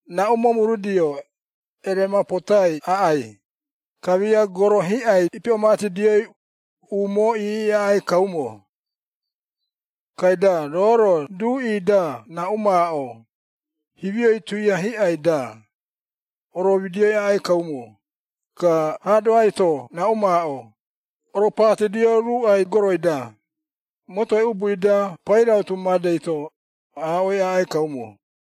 Raꞌu momurudio, eremapotai aꞌai, kamia goro hiꞌai iipiꞌomatidioi, umoo iiꞌi aꞌai kaumo. Kaida roo-ro duꞌi-da raꞌu maaꞌo, himioi tuia hiꞌai-da, oromidioi aꞌai kaumo, ka haadoai-to raꞌu maaꞌo, oropatidio ruuꞌai goroi-da, motoi ubui-da pairautu madei-to, aaꞌoi aꞌai kaumo.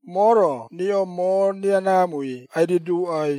“Moo-ro riꞌo moo riaraamui ai-riduuꞌai,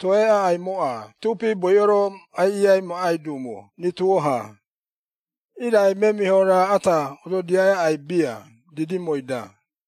toe aꞌaimoꞌa tuupi boiꞌo-ro aiꞌiiai maꞌai duumo rituo-ha, irai memiho raa ata ododiai aꞌai bia didimoi-da.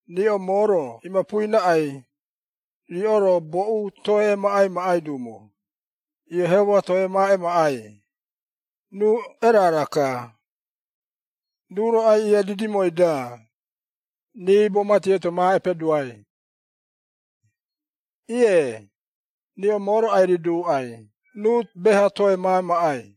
Riꞌo moo-ro imapui raꞌai, riꞌo-ro boꞌu toe emaꞌai maꞌai duumo, Iehoma toe ma emaꞌai, ruu erara-ka, ruu-ro aiꞌiia didimoi-da, riibo mati eito ma epeduai. Ie, riꞌo moo-ro ai-riduuꞌai ruu beha-ha toe ma emaꞌai.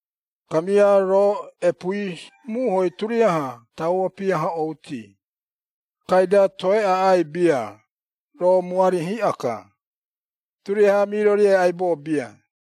Kamia roo epuui muhoi turiaha tauo piahoꞌouti, kaida toe aꞌai bia, roo muari hiꞌa-ka, turiaha miroriai aibo bia.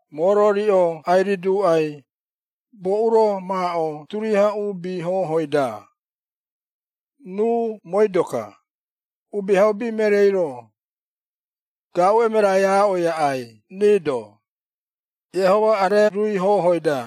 “Moo-ro riꞌo ai-riduuꞌai, boꞌu-ro maaꞌo turiaha uubi hoohoi-da, ruu mooi-doka, Uubihaubi Mereei-ro, gaaꞌu emerai aaꞌoi aꞌai rii-do, Iehoma arerui hohooi-da.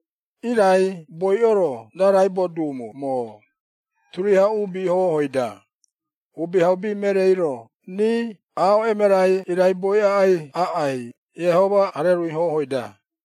Irai boiꞌo-ro raraibo duumo moo, turiaha uubi hoohoi-da, Uubihaubi Mereei-ro rii aaꞌo emerai iraiboi aꞌai Iehoma arerui hohooi-da.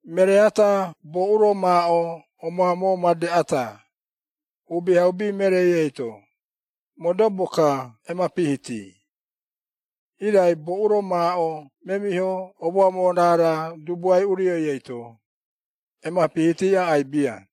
“Meree ata boꞌu-ro maaꞌo omoamoo made ata, Uubihaubi Mereei eito, modobo-ka emapihiti, irai boꞌu-ro maaꞌo memiho omoamoo raara Dubuae Urioi eito, emapihiti aꞌai bia.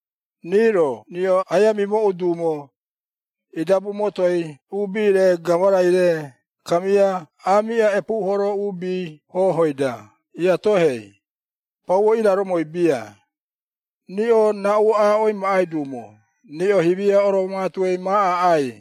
“Rii-ro riꞌo aia mimooꞌu duumo, idabu motoi uubi-re gamarai-re kamia aamiꞌa epuuhoro uubi hohooi-da iatohei, pauo iraromoi bia, riꞌo raꞌu aaꞌoi maꞌai duumo riꞌo himia oroomatuei ma aꞌai.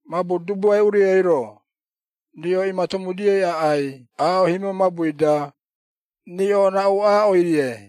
Mabu Dubuae Urioi-ro, riꞌo imatomudioi aꞌai aaꞌo himio mabui-da, riꞌo raꞌu aaꞌoi-rie.”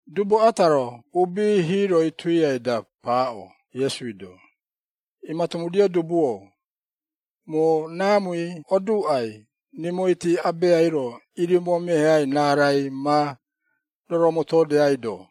Dubu ata-ro uubi hiiroi tuiai-da paaꞌo Iesui-do, “Imatomudio dubu-o, moo raamui oduuꞌai, rimoiti abeai-ro irimoameheai raarai, ma roromotoodeaido.”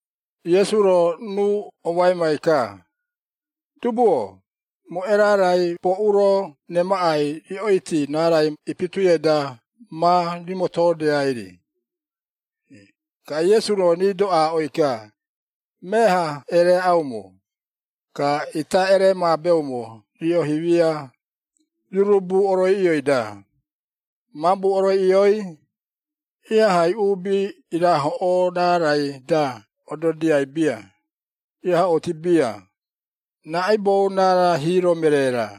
Iesu-ro ruu omoaimai-ka, “Dubu-o, moo erarai boꞌu-ro remaꞌai riꞌoiti raarai ipituiai-da ma rimotoodeai-ri?” Ka Iesu-ro rii-do aaꞌoi-ka, “Meaha ereaꞌaumo, ka ita ereemaabeumo riꞌo himia, rurubu oroiꞌioi-da, mabu oroiꞌioi, ihahai uubi iraahoꞌoo raarai-da ododiai bia, iahoꞌouti bia, raꞌaibou raara hiiro meree-ra.”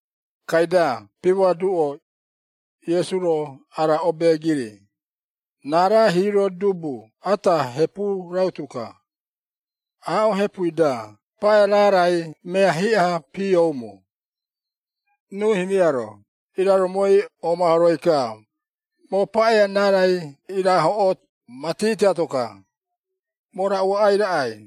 Kaida pimoaduꞌo, Iesu-ro ara obeegiri, “Raara hiiro dubu ata hepu rautu-ka, aaꞌo hepui-da paꞌea raarai mea hiꞌa-ha piooumo. Ruu himia-ro iraromoi oomahoroi-ka, ‘Moo paꞌea raarai iraahoꞌoo mati tiato-ka, moo raꞌu aꞌai raꞌai?’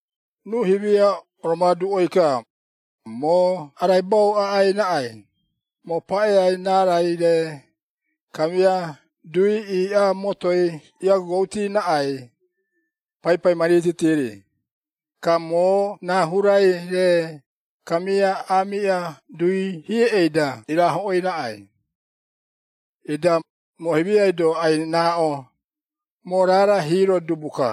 Ruu himia oromoaduꞌoi-ka, ‘Moo araibau aꞌai raꞌai, moo paꞌea raarai-re, kamia dui iiꞌa motoi iagogouti raꞌai, paipai ma riititi-ri, ka moo raa hurai-re, kamia aamiꞌa dui hiei-da iraahoꞌooi raꞌai. Ida, moo himiai-do ai-raaꞌo, moo raara hiiro dubu-ka!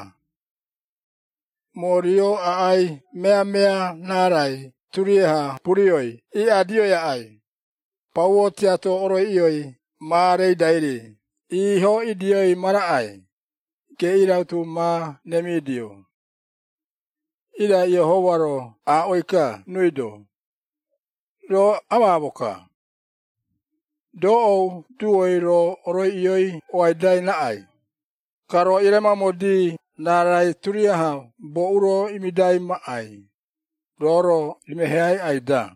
Moo rio aꞌai meamea raarai turiaha burioi iiꞌadioi aꞌai, pauo tiato oroiꞌioi ma reidai-ri iiho idioi ma raꞌai, geꞌii rautu ma remidio!’ Irai Iehoma-ro aaꞌoi-ka ruui-do, ‘Roo amaamo-ka! Doꞌou duoi roo oroiꞌioi oaidai raꞌai, ka roo ieremaumodi raarai turiaha boꞌu-ro imidai maꞌai, roo-ro imeheai aꞌai-da?’”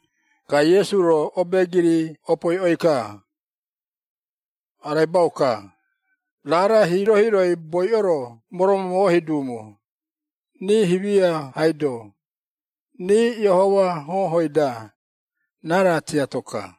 Ka Iesu-ro obeegiri opoiꞌoi-ka, “Araibau-ka, raara hiiro-hiiroi boiꞌo-ro moromomohi duumo, rii himia-haido, rii Iehoma hohoi-da, raara tiato-ka.”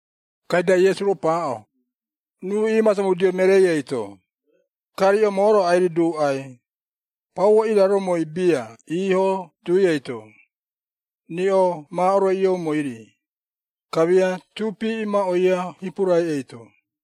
Kaida Iesu-ro paaꞌo, ruu iimatomudio mereei eito, riꞌo moo-ro ai-riduuꞌai, pauo iraromoi bia iiho dui eito, riꞌo ma oroiꞌioumoi-ri, kamia tuupi imaꞌoia hipurai eito!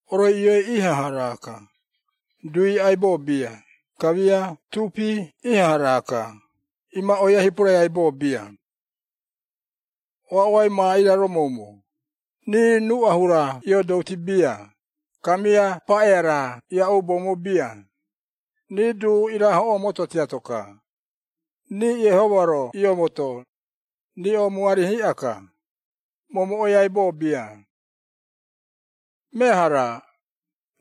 Oroiꞌioi ihaha raa-ka, duui aibo bia, kamia tuupi ihaha raa-ka, imaꞌoia hipurai aibo bia. Oaꞌoai ma iraromoumo, rii ruꞌa hura ioodouti bia, kamia paꞌea raa iaꞌuboumo bia, rii duu iraahoꞌoo moto tiato-ka, rii Iehoma-ro iomoto, riꞌo muari hiꞌa-ka, momoꞌoi aibo bia. Meaha-ra,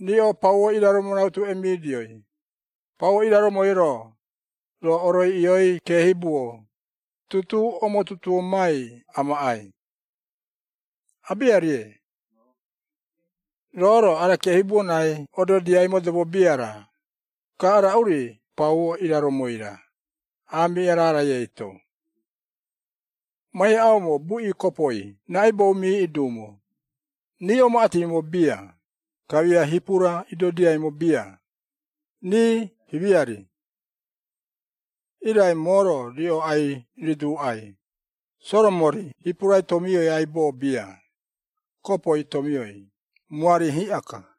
riꞌo pauo iraromo rautu emidioi, pauo iraromoi-ro, roo oroiꞌioi keehibuo, tutuu omotutuomai amaꞌai? Abiarie. Roo-ro ara keehibuo raai ododiai modobo bia-ra, ka raꞌu-ri pauo iraromoi-ra, aamiꞌa raarai eito. Ma iaꞌaumo buꞌi kopoi raꞌaibou miiꞌi duumo, rii omaꞌatimo bia, kamia hipura idodiaimo bia, rii himia-ri. Irai moo-ro riꞌo ai-riduuꞌai, Soromori hipurai tomioi aibo bia, kopoi tomioi, muari hiꞌa-ka.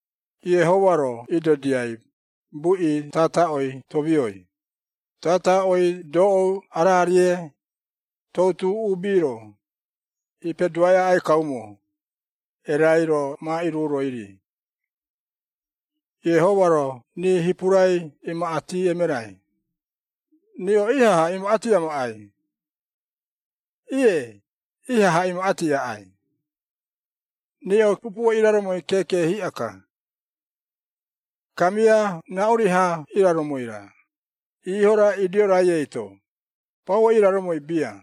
Iehoma-ro iidodiai, buꞌi tataꞌoi tomioi, tataꞌoi doꞌou araarie, toutu uubi-ro, iipeduai aꞌai kaumo, erai-ro ma iruuroi-ri. Iehoma-ro rii hipurai imaꞌati emerai, riꞌo ihaha imaꞌati amaꞌai? Ie, ihaha imaꞌati aꞌai! Riꞌo pupuo iraromoi keeke hiꞌa-ka! “Kamia raꞌuri-ha iraromoi-ra, iiho-ra, idioi-rai eito, pauo iraromoi bia.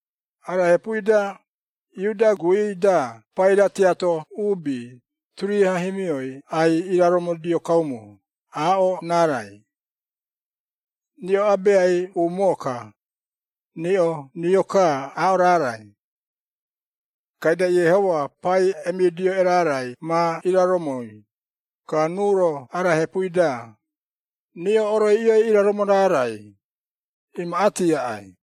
Ara hepui-da, Iuda guui-da paira tiato uubi, turiaha himioi ai-iraromodio kaumo, aaꞌo raarai. Riꞌo abeai umoo-ka, riꞌo rio-ka aaꞌo raarai. Kaida Iehoma pai emidio erarai ma iraromoi, ka ruu-ro ara hepui-da, riꞌo oroiꞌioi iraromo raarai, imaꞌati aꞌai.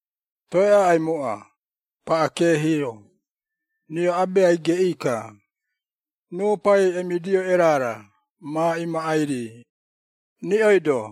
“Toe aꞌaimoꞌa, paꞌa keehi-o, riꞌo Abeai geꞌii-ka, ruu Pai emidio erara ma imaꞌai-ri, riꞌoi-do.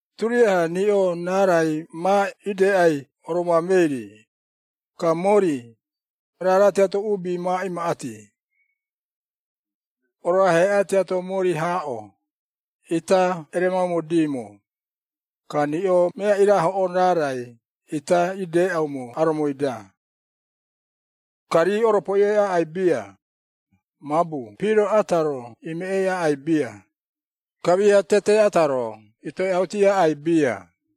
Turiaha riꞌo raarai ma ideꞌai oromoamei-ri, ka mori, raara tiato uubi ma imaꞌati. Oroaheꞌa tiato mori haaꞌo, ita eremaumodiimo, ka riꞌo mea irahoꞌoo raarai ita ideꞌaumo aromoi-da. Ka rii oropoiꞌoi aꞌai bia, mabu piro ata-ro imeꞌei aꞌai bia, kamia tete ata-ro itoeꞌauti aꞌai bia.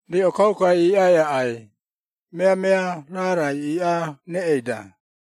Riꞌo kaukai iiꞌai aꞌai, meamea raarai iiꞌaa reꞌei-da.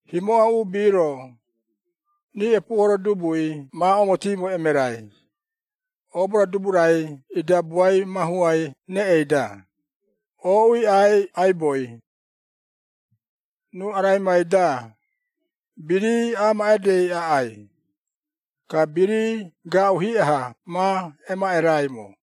himoꞌa uubi-ro, rii epuuhoro dubui ma omotiimo emerai, oobo-ra dubu-rai idabuai mahuai reꞌei-da, ooꞌui aꞌai aiboi. Ruu araimai-da, birii amaaꞌedei aꞌai, ka birii gaaꞌu hiꞌa-ha ma emaꞌeraimo.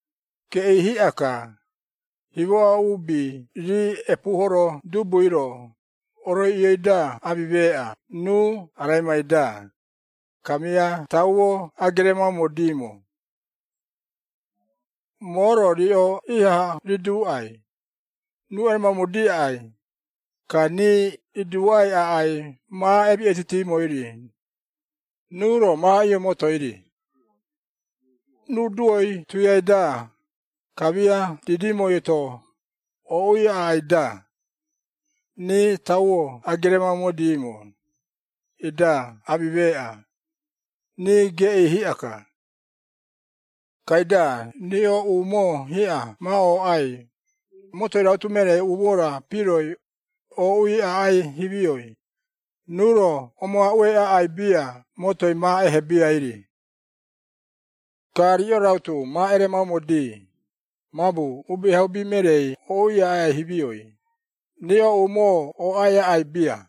Geꞌii hiꞌa-ka, himoꞌa uubi rii epuuhoro dubui-ro, oroiꞌioi-da amimeeꞌa ruu araimai-da, kamia tauo ageremaumodiimo! Moo-ro riꞌo ihaha riduuꞌai, ruu eremaumodi aꞌai, ka rii iduuꞌai aꞌai ma emiꞌeitutimoi-ri, ruu-ro ma iomotoi-ri. Ruu duoi tuiai-da, kamia didimoi-to ooꞌui aꞌai-da, rii tauo ageremaumodiimo, ida amimeeꞌa, rii geꞌii hiꞌa-ka. Kaida riꞌo umoo hiꞌa ma ooꞌai, motoi rautu mereei umoo-ra piroi, ooꞌui aꞌai himioi, ruu-ro omoaꞌuei aꞌai bia motoi ma ehebiai-ri. Ka riꞌo rautu ma eremaumodi, mabu Uubihaubi Mereei ooꞌui aꞌai himioi, riꞌo umoo ooꞌai aꞌai bia.”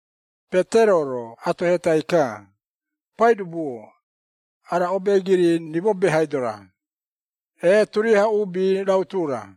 Petero-ro atohetai ka, “Paidubu-o, ara obeegiri rimo behaido-ra, ee turiaha uubi rautu-ra?”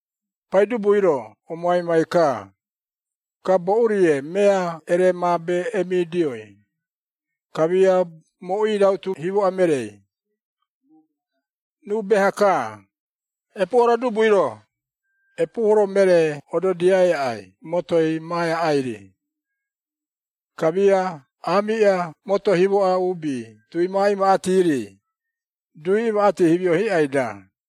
Paidubui-ro omoaimai-ka, “Ka boꞌu-rie mea eremaabe emidioi, kamia moꞌui rautu himoꞌa mereei? Ruu beha-ka, epuuhoro dubui-ro, epuuhoro meree ododiai aꞌai motoi ma eaꞌai-ri, kamia aamiꞌa moto himoꞌa uubi duui ma imaꞌati-ri, duui imaꞌati himio hiꞌai-da.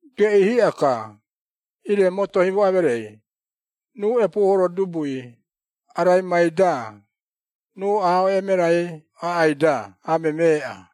Geꞌii hiꞌa-ka, ire moto himoꞌa mereei, ruu epuuhoro dubui, araimai-da, ruu aaꞌo emerai aꞌai-da amemeeꞌa!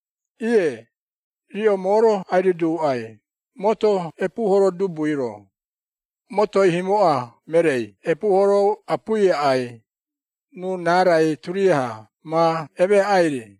Ie, riꞌo moo-ro ai-riduuꞌai, moto epuuhoro dubui-ro, motoi himoꞌa mereei epuuhoro apui aꞌai, ruu raarai turiaha ma emeaꞌai-ri.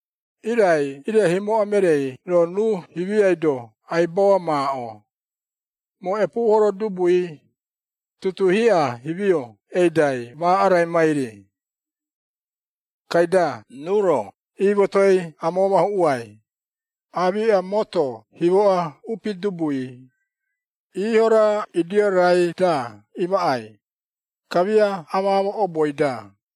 Irai ire himoꞌa mereei-ro, ruu himiai-do aibau amaaꞌo, ‘Moo epuuhoro dubui, tutuu hiꞌa himio eidai ma araimai-ri.’ Kaida ruu-ro iimotoi amoomahuꞌuai, aamiꞌa moto himoꞌa upi dubui, iiho-ra idiorai-da imaꞌai, kamia amaamo oboi-da.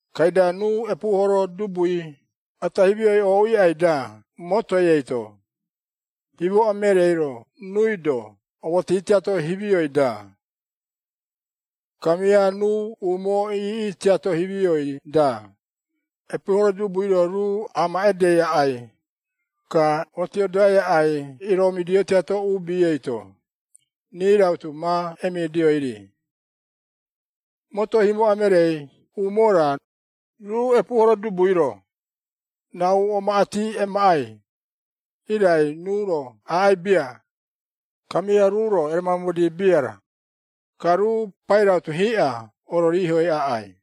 Kaida ruu epuuhoro dubui ata himioi ooꞌui aꞌai-da motoi eito, himoꞌa mereei-ro ruui-do omoti tiato himioi-da, kamia ruu umoo iiꞌi tiato himioi-da, epuuhoro dubui-ro ruu amaꞌadei aꞌai, ka otiodoai aꞌai iroomidio tiato uubi eito, rii rautu ma emidioi-ri. “Moto himoꞌa mereei umoo-ra, ruu epuuhoro dubui-ro, raꞌu omaꞌati emaꞌai, irai ruu-ro aꞌai bia, kamia ruu-ro ereemaumodi bia-ra, ka ruu pairautu hiꞌa ororihoi aꞌai.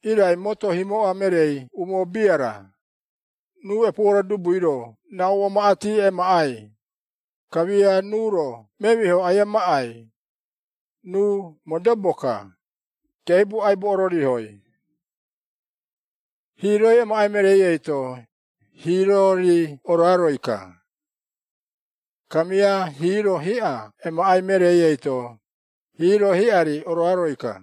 Irai moto himoꞌa mereei umoo bia-ra, ruu epuuhoro dubui-ro raꞌu omaꞌati emaꞌai, kamia ruu-ro memiho aia maꞌai, ruu modobo-ka, keehibuo aibo ororihoi. Hiiroi emaꞌai mereei eito, hiiro-ri oroaroi-ka. Kamia hiiro hiꞌa emaꞌai mereei eito, hiiro hiꞌa-ri oroaroi-ka.”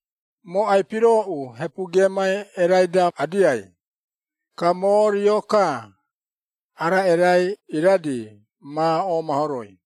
“Moo ai-pirooꞌu hepu geemai erai-da adiai, ka moo rio-ka ara erai iradi ma oomahoroi!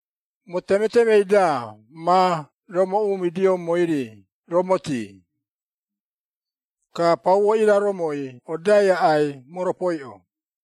Moo temetemei-da ma romoꞌuumidioumoi-ri romotii, ka pauo iraromoi odai aꞌai moropoiꞌo!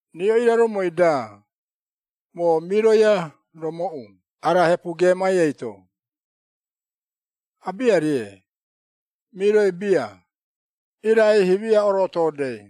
Riꞌo iraromoi-da, moo miroi aromooꞌu ara hepu geemai eito? Abiarie, miroi bia, irai himia orootoodei!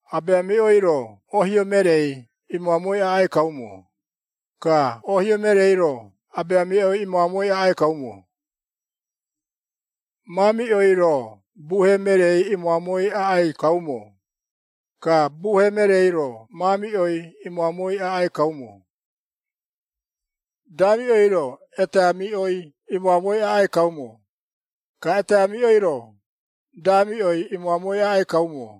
Abeamiꞌoi-ro ohio mereei imoamoi aꞌai kaumo, ka ohio mereei-ro abeamiꞌoi imoamoi aꞌai kaumo. Maamiꞌoi-ro buhe mereei imoamoi aꞌai kaumo, ka buhe mereei-ro maamiꞌoi imoamoi aꞌai kaumo. Daamiꞌoi-ro eteamiꞌoi imoamoi aꞌai kaumo, ka eteamiꞌoi-ro daamiꞌoi imoamoi aꞌai kaumo.”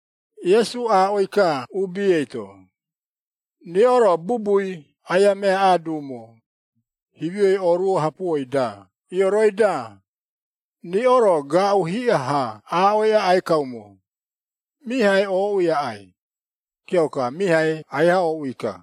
Iesu aaꞌoi-ka uubi eito, “Riꞌo-ro bubui aia meaꞌaa duumo, himioi ooruo hapuoi-da ioroi-da, riꞌo-ro gaaꞌu hiꞌa-ha aaꞌoi aꞌai kaumo, ‘Mihaei ooꞌui aꞌai,’ kiauka mihaei aiha ooꞌui-ka.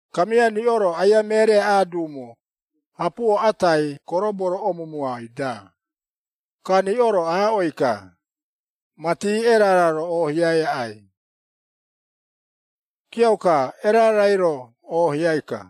Kamia riꞌo-ro aia mereaꞌaa duumo, hapuo atai koroboi omumui-da, ka riꞌo-ro aaꞌoi-ka, ‘Mati erara-ro oohiai aꞌai.’ Kiauka, erarai-ro oohiai-ka.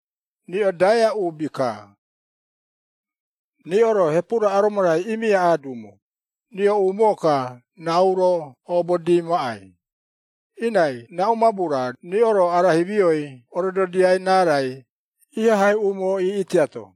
Riꞌo daea uubi-ka! Riꞌo-ro hepu-ra aromo-rai imiaꞌaa duumo, riꞌo umoo-ka raꞌu-ro oobodi maꞌai, irai raꞌu mabu-ra riꞌo-ro ara himioi orododiai raarai ihahai umoo iiꞌi tiato?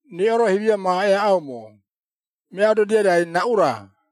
“Riꞌo-ro himia ma eaꞌaumo, mea ododiai raai raꞌu-ra?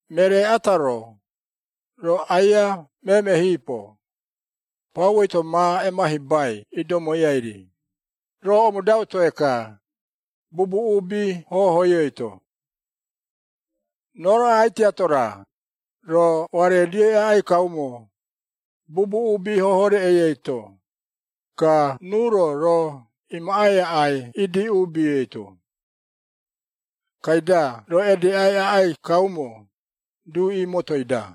Meree ata-ro, roo aia meemehiipo, pauoi-to ma emahibai idomoiai-ri, roo omodau toe-ka, bubu uubi hohooi eito. Roo-ro aꞌai tiato-ra, roo oaredioi aꞌai kaumo, bubu uubi hohoo reꞌei eito, ka ruu-ro roo imaꞌai aꞌai idi uubi eito. Kaida roo edeꞌai aꞌai kaumo, duꞌi motoi-da.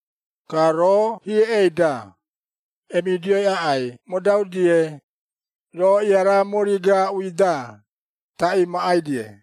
Ka roo hieꞌei-da, emidioi aꞌai modau-die, roo iaraa mori gaaꞌui-da, taꞌii maꞌai-die.”